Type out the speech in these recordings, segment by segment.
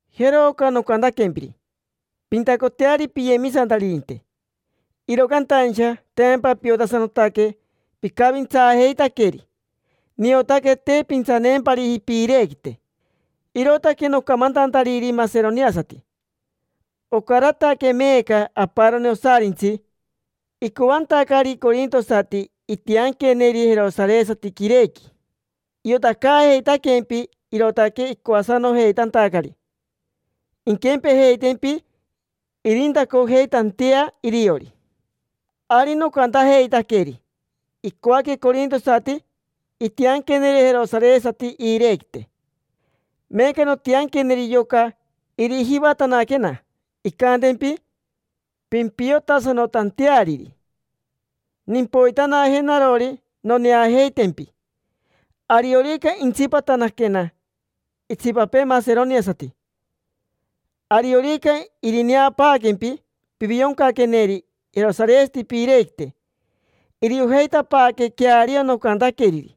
Jero oca nocantaquempiri: “Pintacoteari piyemisantaririnte”. Iro cantaincha tempa piotasanotaque picavintsaajeitaqueri. Niotaque te pintsaneempariji piirequite, irootaque nocamantantariri maseroniasati: “Ocarataque meeca aparoni osarintsi icoantacari corintosati intianqueneri jerosaresati quirequi”. Iotacojeitaquempi, irootaque icoasanojeitantacari inquempejeitempi, irintacojeitantea iriori. Ari nocantajeitaqueri: “Icoaque corintosati intianqueneri jerosaresati iirequite”. Meeca nontianqueri yoca irijivatanaquena, incantempi pimpiotasanotanteariri. Nimpoitanaje narori noneajeitempi, ariorica intsipatanaquena itsipapee maseroniasati. Ariorica irineapaaquempi pivioncaqueneri jerosaresati piirequite, iriojeitapaaque queario nocantaqueriri,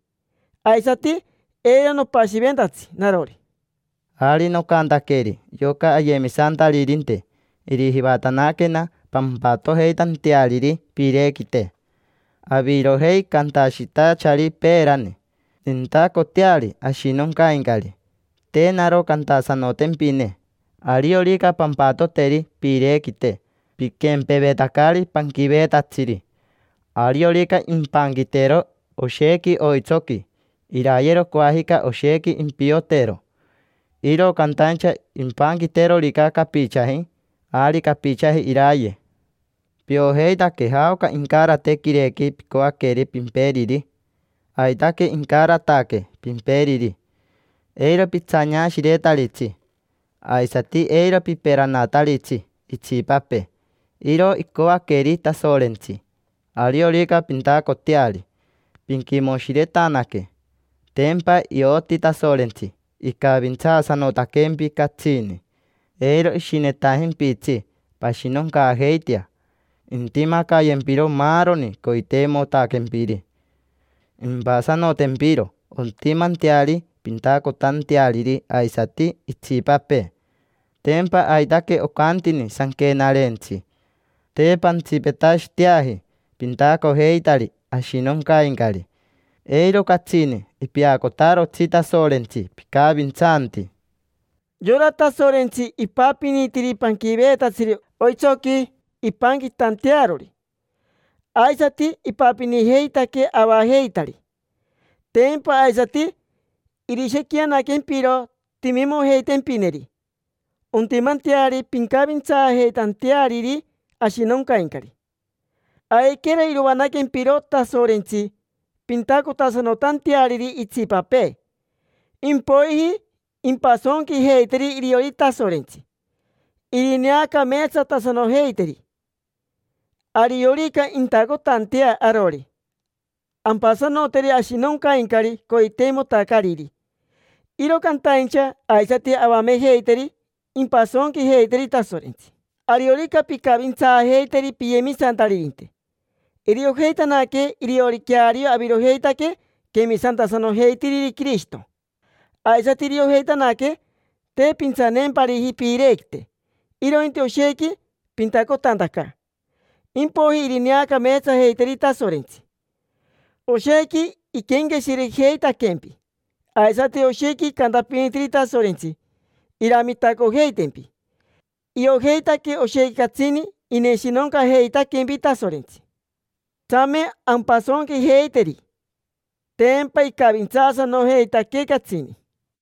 aisati eiro nopashiventatsi narori. Ari nocantaqueri yoca ayemisantaririnte irijivatanaquena, pampatojeitanteariri piirequite. Avirojei cantashitachari peerani: “Nintacoteari ashinoncaincari”, te naro cantasanotempine. Ariorica pampatoteri piirequite, piquempevetacari panquiveetatsiri: ariorica impanquitero oshequi oitsoqui, irayero coajica oshequi, impiotero. Iro cantaincha impanquiterorica capichaji, ari capichaji iraye. Piojeitaque jaoca incarate quirequi picoaqueri pimperiri. Aitaque incarataque pimperiri. Eiro pitsaneashiretaritsi, aisati eiro piperanataritsi itsipapee. Iro icoaqueri Tasorentsi ariorica pintacoteari, pinquimoshiretanaque. Tempa ioti Tasorentsi icavintsaasanotaquempi catsini, eiro ishinetajimpitsi pashinoncaajeitea. Intimacayempiro maaroni coiteimotaquempiri, impasanotempiro ontimanteari pintacotanteariri aisati itsipapee. Tempa aitaque ocantini Sanquenarentsi: “Te pantsipetashiteaji pintacojeitari ashinoncaincari, eiro catsini ipeacotarotsi Tasorentsi picavintsanti”. Yora Tasorentsi ipapinitiri panquiveetatsiri oitsoqui impanquitantearori, aisati ipapinijeitaquee avajeitari. Tempa aisati irishequianaquempiro timimojeitempineri ontimanteari pincavintsaajeitanteariri ashinoncaincari. Aiquero irovanaaquempiro Tasorentsi, pintacotasanotanteariri itsipapee. Impoiji impasonquijeiteri iriori Tasorentsi, irineacameetsatasanojeiteri. Ariorica intacotantea arori, ampasanoteri ashinoncaincari coiteimotacariri. Iro cantaincha aisati avamejeiteri impasonquijeiteri Tasorentsi. Ariorica pincavintsaajeiteri piyemisantaririnte, iriojeitanaque iriori queario avirojeitaque quemisantasanojeitiriri Quirishito. Aisati iriojeitanaque te pintsaneempariji piirequite, irointi oshequi pintacotantaca, impoiji irineacameetsajeiteri Tasorentsi. Oshequi iquenqueshirejeitaquempi, aisati oshequi icantapinitiri Tasorentsi iramitacojeitempi. Iojeitaque oshequi catsini ineshinoncajeitaquempi Tasorentsi. Tsame ampasonquijeiteri, tempa icavintsaasanojeitaquee catsini.